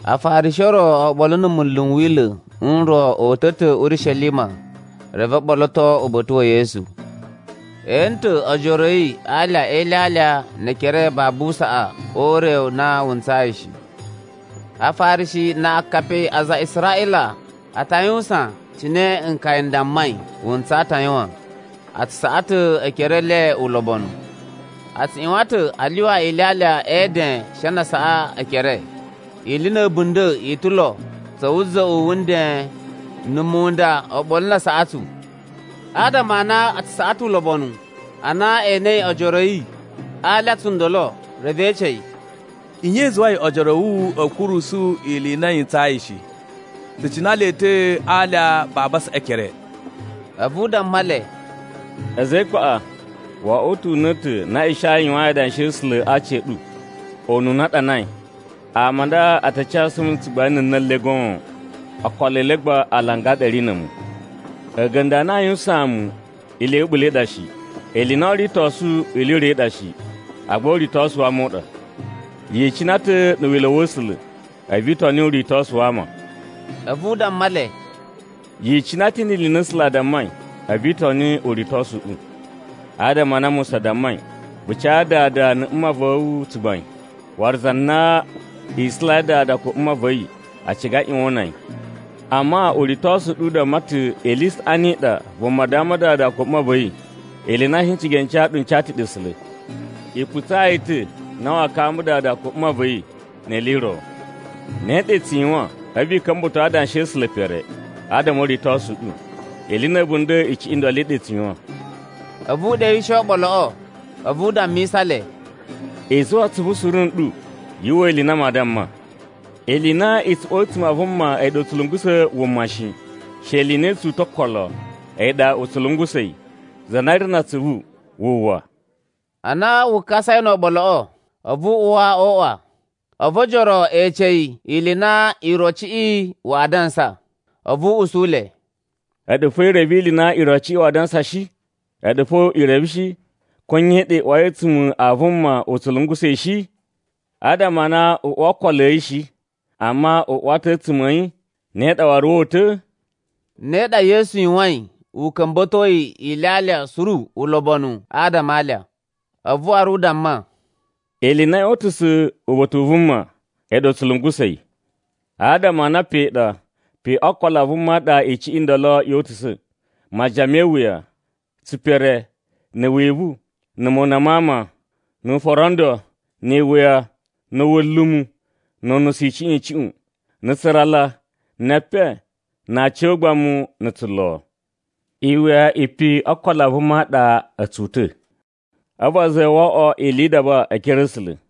Afarishi o ro oɓolo na̱ munlu n Wila̱ n ro o uta̱ ta̱ Urishelima reve o ɓoloto uba̱ta̱ wa̱ Yesu. E ene ta̱ ojoro a̱ yi a alya e ilyalya ne ekere babu saꞌa o ure u na wu ntsayi shi. Afarishi na akapi a aza a Israꞌila a ta yuwusan cine nkaya n dammai wu ntsaa ta̱ a yuwan. A tsu saꞌa ta̱ ekere e le ulobonu. A tsu ꞌyuwan ta̱ a lyuwa ilyalya e eden she na a saꞌa ekere. Ili na̱ a̱bunda̱ i ta̱ lo, tsa̱ wuza̱ꞌu wu nden, na̱ munda oɓolo na asaꞌatsu. Adama a na a tsu saꞌa ta̱ ulobonu, ana e enei ojoro a̱ yi a alya tsundolo, reve e ece yi, “Nye i zuwai ojoro a̱ wu a̱ kurusu ili i na yi ntsayi shi? Tsu cina le ta̱ a alya babu a saꞌa ekere.” A̱vu u damma le, “A̱za̱ e ikpaꞌa! Wo oꞌwo ta̱ una̱ta̱ na Ishaya yuwain adanshi a̱ A̱sula̱ a aci a̱ ɗu. Ununa a ɗanai, ‘Ama a nda a ta casu mu tsugbain a̱ na̱ le goon, okolo e le gba alanga a ɗa a̱ ri na̱ a̱mu. A̱ga̱nda̱ a na aa yuwusaan mu ili ya̱ a̱ɓula̱ i ɗa shi. Ili i na oo ritosu ili i ro i ɗa shi, agba uritosu wa ama u ɗa.’ “Yi icina ta̱ na̱ wila̱ wa̱ A̱sula̱, a̱vu i toni uritosu wa ama.” A̱vu u damma le, “Yi icina ta̱ ni ili i na A̱sula̱ a dammai, a̱vu i toni uritosu u ɗu. Adama a na Musa dammai, ‘Vu ca dada na̱ mma va̱ wu tsugbain. Waru za na isulai dada ko mma va̱ yi, a ciga a ꞌyuwan o una yi.’ Amma uritosu u ɗu u damma ta̱ ili i saꞌani i ɗa vuma damma dada ko mma va̱ yi, ili i na n shi a ca ɗu n ca ta̱ ɗe A̱sula̱. I putsa yi ta̱ na waa kamba dada ko mma va̱ yi ni ili i ro. Ne ɗa i tsu yuwan, a̱vu i ka̱mba̱to adanshi a̱ A̱sula̱ pere, adama o uritosu u ɗu, ili i na̱ a̱bunda̱ icuꞌun i ndolo i ɗa i tsu yuwan.” A̱vu u ɗewishe oɓoloꞌo, a̱vu u dammisa le, “I zuwa atsuvu suru nɗu yu uwwa ili i na maa damma. Ili i na i tsu uwa a̱tsuma̱ a vuma a̱yi ɗa u tsu lungusa̱ wuma wa̱ yi shi, she ili i na i tsu uta̱ o okolo, a̱yi ɗa u tsu lungusa̱ yi. [Za na ri na atsuvu, wu uwwa.]” Ana wu kasai no oɓoloꞌo, a̱vu u uwa o uꞌwa. A̱vu ojoro e ece yi ili i na irociꞌi waa dansa. A̱vu u usu le, “A̱ɗu fo i reve ili i na irociꞌi waa dansa shi? A̱ɗu fo i reve shi, ko nye ɗa i uwai a̱ a̱a̱tsuma̱ a vuma, u tsu lungusa̱ yi shi? Adama a na u uwa o okolo a̱ yi shi, amma u uwa ta̱ a̱ a̱a̱tsuma̱ a̱ yi, ne ɗa waru woo uta̱?” Ne ɗa Yesu yuwain u ka̱mba̱toi ilyalya suru ulobonu adama a alya. A̱vu waru u damma, “Ili i na yoo utusa̱ uba̱ta̱ u vuma, a̱yi ɗa u tsu lungusa̱ yi. Adama a na pe ɗa, pe o okolo a vuma ɗa icuꞌun i nda yo utusa̱: majiyan me iwuya, tsipere, na̱ wivu, na̱ mona ma ama, nu uforondo, ni iwuya, na̱ wulumu, nu unusu icuꞌun icuꞌun, na̱ tsurala, ne epen, na aci o ugbamu na̱ tsulo. Iwuya i pe o okolo a vuma a ɗa a̱ tsu uta̱, a̱vu a zuwa yi wo oꞌwo ili yi idaba e ekere a̱ A̱sula̱.”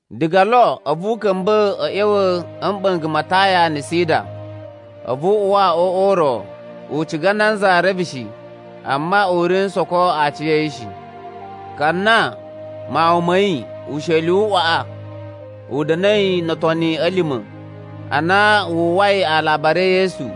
Diga lo a̱vu u ka̱mba̱ a̱ ꞌya̱wa̱ a̱ mɓa̱nga̱ ma Taya na̱ Sida. A̱vu u uwa o uꞌwa u ro, u ciga nanza reve shi, amma u ri n soko aciya̱yi shi. Ka na mawun ma̱ yi, usheli u waꞌa u da̱na̱i no otoni a̱ lima̱, ana wu uwwai alabari e Yesu,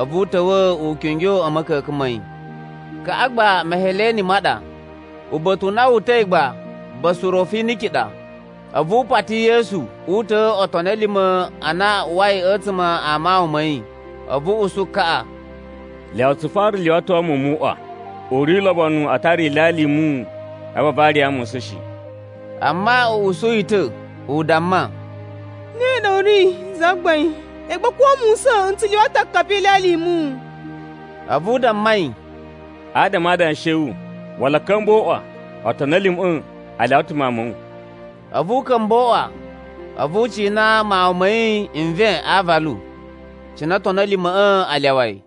a̱vu u ta̱wa̱ u kingyo a̱ ma̱ka̱ka̱n ma̱ yi. Kaꞌa gba Meheleni ma ɗa, uba̱ta̱ u na wu uta̱i gba Basurofiniki ɗa. A̱vu u pati Yesu uta̱a̱ otoni a̱ lima̱ a na a uwai a̱tsuma̱ a mawun ma̱ yi. A̱vu u usu kaꞌa, “Lyawa tsu fara lyuwato muwun mu uꞌwa. U ri ulobonu a tara ilyalya i muwun a̱vu a variya musa̱n shi.” Amma u usu yi ta̱, u damma, “Ne ɗa u ri Zagbain, agba ko musa̱n n tsu lyuwa ta̱ akapi e ilyalya i muwun.” A̱vu u damma yi, “Adama a adanshi a̱ wu, wala a̱ ka̱mba̱ o uꞌwa, otoni a̱ lima̱ꞌa̱ a lyawa ta̱ mawun ma̱ wu.” A̱vu u ka̱mba̱ o uꞌwa, a̱vu u cina mawun ma̱ yi nven a aavalu. Cina otoni a̱ lima̱ꞌa̱ a lyawa yi.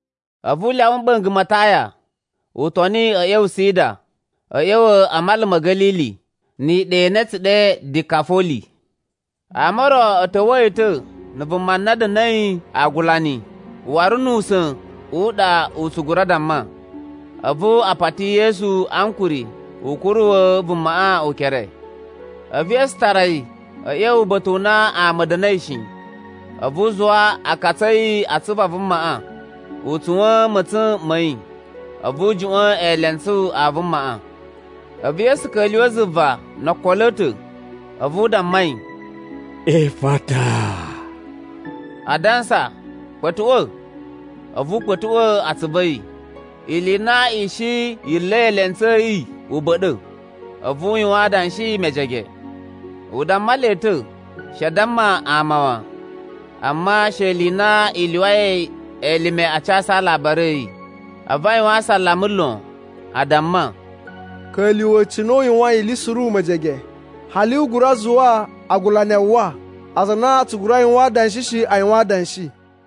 A̱vu u lyawa mɓa̱nga̱ ma Taya, u toni a̱ ꞌya̱wa̱ Sida a̱ ꞌya̱wa̱ a Mala ma̱ Ga̱lili, ni iɗa i na a̱ tsu ɗe Dikafoli. Ama o ro a̱ ta̱wa̱a̱ yi ta̱ na̱ vuma na da̱na̱i aagulani waru nu usa̱n u ɗa u tsu gura damma, a̱vu a pati Yesu ankuri u kuruwa̱ vumaꞌa ukere. A̱vu Yesu tara yi a̱ ꞌya̱wa̱ uba̱ta̱ u na ama a̱ da̱na̱i shi, a̱vu u zuwa akatsu a̱ yi a atsuvu a vumaꞌa, u tsuwa̱n ma̱tsa̱n ma̱ yi, a̱vu u juꞌwa̱n eelentsu a vumaꞌa. A̱vu Yesu ka̱lyuwa̱ zuva no okolo a̱ ta̱, a̱vu u damma yi, “Ifata!” adansa, “Kpa̱tuꞌwa̱!” A̱vu u kpa̱tuꞌwa̱ atsuvu a̱ yi. Ili i na i shi yi nla̱i eelentsu a̱ yi, u ba̱ɗa̱. A̱vu u yuwan adanshi mejege. U damma le ta̱ she a damma ama wan, amma she ili i na i lyuwai elime a casu alabari a̱ yi. A̱vu a yuwan asalama lon, a damma, “Ka̱lyuwa̱ cine u yuwain iliꞌi suru mejege. Hali u gura zuwa agulani a uwwa. Aza a na a tsu gura yuwan adanshi shi, a yuwan adanshi.”